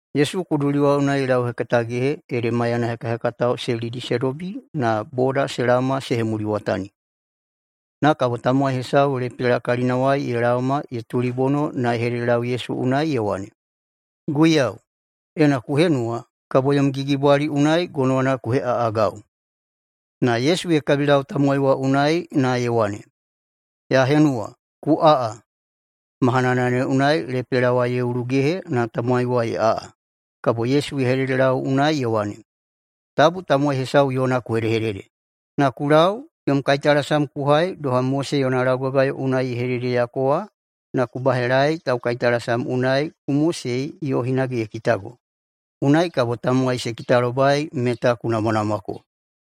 Yesu kuduli wa unai ye lauhekatagehe ede maiyana hekahekatao se lidi se dobi na boda se laoma se hemuliwatani. Na kabo tamowai hesau lepela kalinawai ye laoma ye tulibono na ye hededelau Yesu unai ye wane, “Guiyau, ena ku henuwa, kabo yom gigibwali unai gonowana ku heꞌaꞌagau.” Na Yesu ye kabilau tamowai wa unai na ye wane, “Ya henuwa, ku aꞌa!” Mahanana ne unai lepela wa ye ulugehe na tamowai wa ye aꞌa. Kabo Yesu ye hededelau unai ye wane, “Tabu tamowai hesau yona ku hedehedede! Na ku lau, yom kaitalasam ku hai doha Mose yona laugagayo unai ye hededeyako wa na ku bahelaei taukaitalasam unai ku mosei yo hinage ye kitago, unai kabo tamowai se kitalobai meta ku namwanamwako.”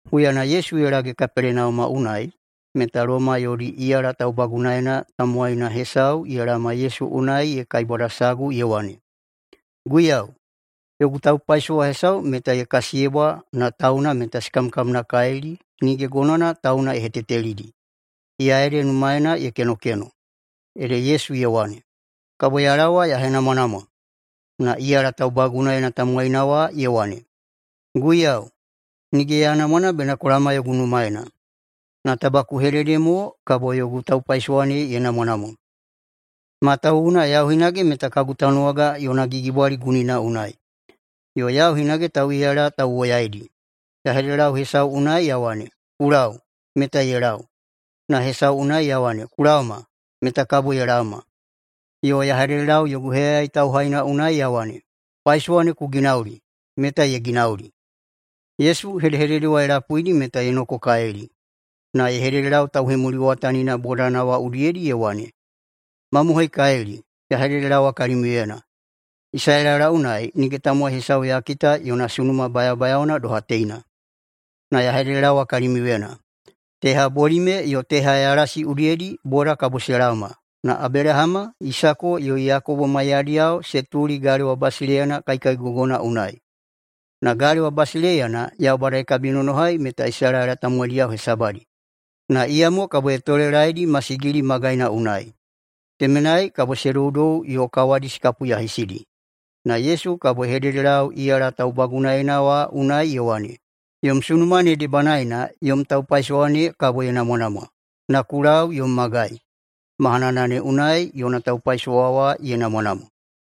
Huyana Yesu ye lage Kapelenauma unai meta Loma yodi iyala taubagunaena tamowaina hesau ye laoma Yesu unai ye kaibwadasagu ye wane, “Guiyau, yogu taupaisowa hesau meta ye kasiyebwa na tauna meta se kamkamnakalili nige gonowana tauna ye hetetelidi, iya ede numaena ye kenokeno.” Ede Yesu ye wane, “Kabo ya laowa ya henamwanamwa.” Na iyala taubagunaena tamowaina wa ye wane, “Guiyau, nige ya namwa na bena ku laoma yogu numaena. Na taba ku hedehedede mo kabo yogu taupaisowa ne ye namwanamwa. Matawuwuna yau hinage meta kagu tanuwaga yona gigibwali gunina unai, yo yau hinage tauꞌiyala tauwoyaidi. Ya hededelau hesau unai ya wane, ‘Ku lau’, meta ye lau. Na hesau unai ya wane, ‘Ku laoma’, meta kabo ye laoma. Yo ya hededelau yogu heyayai tauhaina unai ya wane, ‘Paisowa ne ku ginauli’, meta ye ginauli.” Yesu hedehedede wa ye lapuidi meta ye nokokalili. Na ye hededelau tauhemuliwatanina bodana wa udiyedi ye wane, “Mamohoikalili, ya hededelaowa kalimiuyena, Isalaela unai nige tamowai hesau ya kita yona sunuma bayabayaona doha teina! Na ya hededelaowa kalimiuyena, teha bolime yo teha yalasi udiyedi boda kabo se laoma na Abelahama, Isako yo Yakobo maiyadiyao se tuli galewa basileiyana kaikaigogona unai. Na galewa basileiyana ne [Yaubada ye kabinonohai meta Isalaela tamowaidiyao hesabadi, na iyamo] tamowaidi kabo ye tolelaeidi masigili magaina unai. Temenai kabo se doudou yo kawadi se kapuyahisidi.” Na Yesu kabo ye hededelau iyala taubagunaena wa unai ye wane, “Yom sunuma ne debanaena yom taupaisowa ne kabo ye namwanamwa, na ku lau yom magai.” Mahanana ne unai yona taupaisowa wa ye namwanamwa.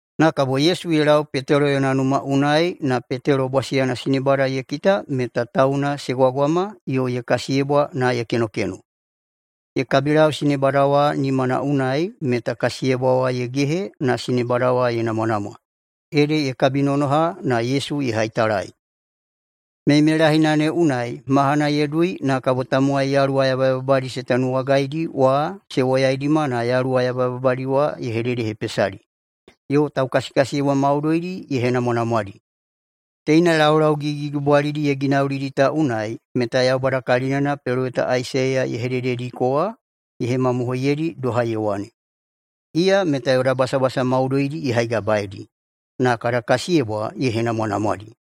Na kabo Yesu ye lau Petelo yona numa unai na Petelo bwasiyana sinebada ye kita meta tauna se gwagwama yo ye kasiyebwa na ye kenokeno. Ye kabilau sinebada wa nimana unai meta kasiyebwa wa ye gehe na sinebada wa ye namwanamwa, ede ye kabinonoha na Yesu ye haitalai. Meimeilahina ne unai mahana ye dui na kabo tamowai yaluwa yabayababadi se tanuwagaidi wa se woyaidima na yaluwa yabayababadi wa ye hededehepesadi. Yo taukasiyebwa maudoidi ye henamwanamwadi. Teina laulau gigigigibwalidi ye ginaulidi ta unai meta Yaubada kalinana peloweta Aisaiya ye hededediko wa ye hemamohoiyeidi doha ye wane, “Iya meta yoda basabasa maudoidi ye haigabaeidi na kada kasiyebwa ye henamwanamwadi.”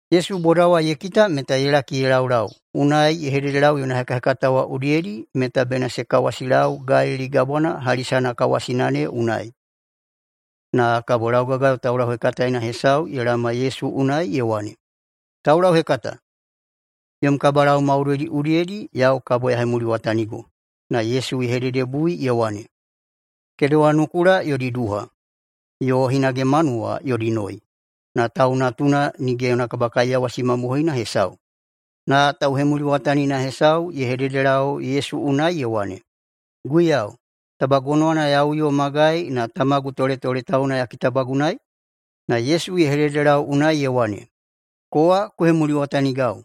Yesu boda wa ye kita meta ye laki ye laulau, unai ye hededelau yona hekahekatao wa udiyedi meta bena se kawasilau Galili Gabwana hali sanakawasina ne unai. Na kabo laugagayo taulauhekataena hesau ye laoma Yesu unai na ye wane, “Taulauhekata, yom kabalau maudoidi udiyedi yau kabo ya hemuliwatanigo.” Na Yesu ye hededebui ye wane, “Kedewa nukula yodi duha, yo hinage manuwa yodi noi, na Tau Natuna nige yona kabakaiyawasi mamohoina hesau.” Na tauhemuliwatanina hesau ye hededelau Yesu unai ye wane, “Guiyau, taba gonowana ya uyo magai na tamagu toletoletauna ya kitabagunaei?” Na Yesu ye hededelau unai ye wane, “Kowa ku hemuliwatanigau,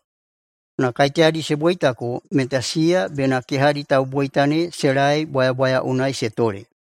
na kaiteyadi se boitako meta siya bena kehadi tauboita ne se lae bwayabwaya unai se tole.”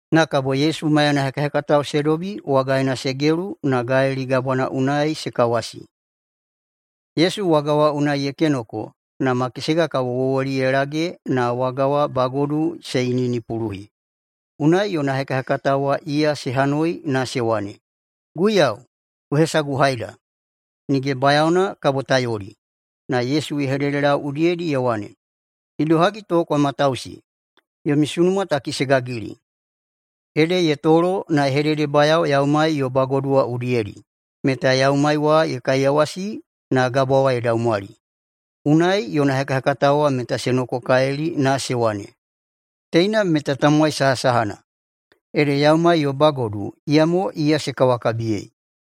Na kabo Yesu maiyana hekahekatao se dobi wagaena se gelu na Galili Gabwana wa unai se kawasi. Yesu waga wa unai ye kenoko na makesega kabo wowoli ye lage na waga wa bagodu se iniꞌinipuluhi. Unai yona hekahekatao wa iya se hanoi na se wane, “Guiyau, ku hesaguhaida! Nige bayaona kabo ta yoli!” Na Yesu ye hededelau udiyedi ye wane, “Idohagi to kwa matausi? Yomi sunuma taki se gagili!” Ede ye tolo na ye hededebayao yaumai yo bagodu wa udiyedi, meta yaumai wa ye kaiyawasi na gabwa wa ye daumwali. Unai yona hekahekatao wa meta se nokokalili na se wane, “Teina meta tamowai sahasahana? Ede yaumai yo bagodu, iyamo iya se kawakabiyei.”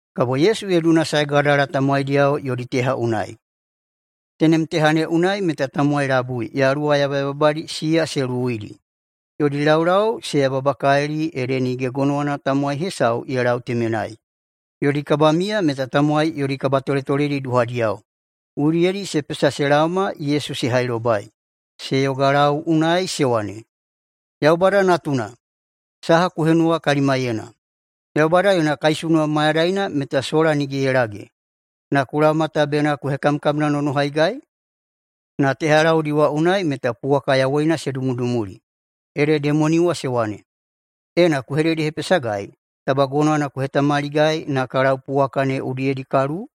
Kabo Yesu ye dunasae Gadala tamowaidiyao yodi teha unai. Tenem teha ne unai meta tamowai labui, yaluwa yabayababadi siya se luwuidi. Yodi laulau se yababakalili ede nige gonowana tamowai hesau ye lau temenai. Yodi kabamiya meta tamowai yodi kabatoletoledi duhadiyao, udiyedi se pesa se laoma Yesu se hailobai. Se yogalau unai se wane, “Yaubada Natuna, saha ku henuwa kalimaiyena? Yaubada yona kaisunuwa mayadaina meta sola nige ye lage, na ku laoma ta bena ku hekamkamnanonohaigai?” Na tehalaudi wa unai meta puwaka yawoina se dumudumuli. Ede demoni wa se wane, “Ena ku hededehepesagai, taba gonowana ku hetamaligai na ka lau puwaka ne udiyedi ka luwu?”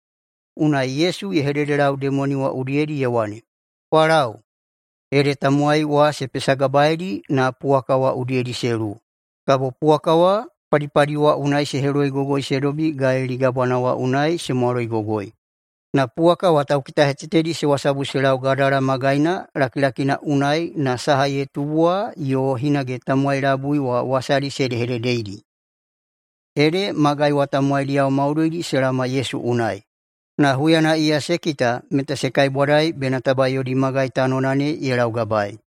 Unai Yesu ye hededelau demoni wa udiyedi ye wane, “Kwa lau!” Ede tamowai wa se pesagabaeidi na puwaka wa udiyedi se luwu. Kabo puwaka wa padipadi wa unai se heloigogoi se dobi Galili Gabwana wa unai se mwaloigogoi. Na puwaka wa taukitahetetedi se wasabu se lau Gadala magaina lakilakina unai na saha ye tubu wa yo hinage tamowai labui wa wasadi se hedehededeidi. Ede magai wa tamowaidiyao maudoidi se laoma Yesu unai. Na huyana iya se kita meta se kaibwadai bena taba yodi magai tanona ne ye laugabaei.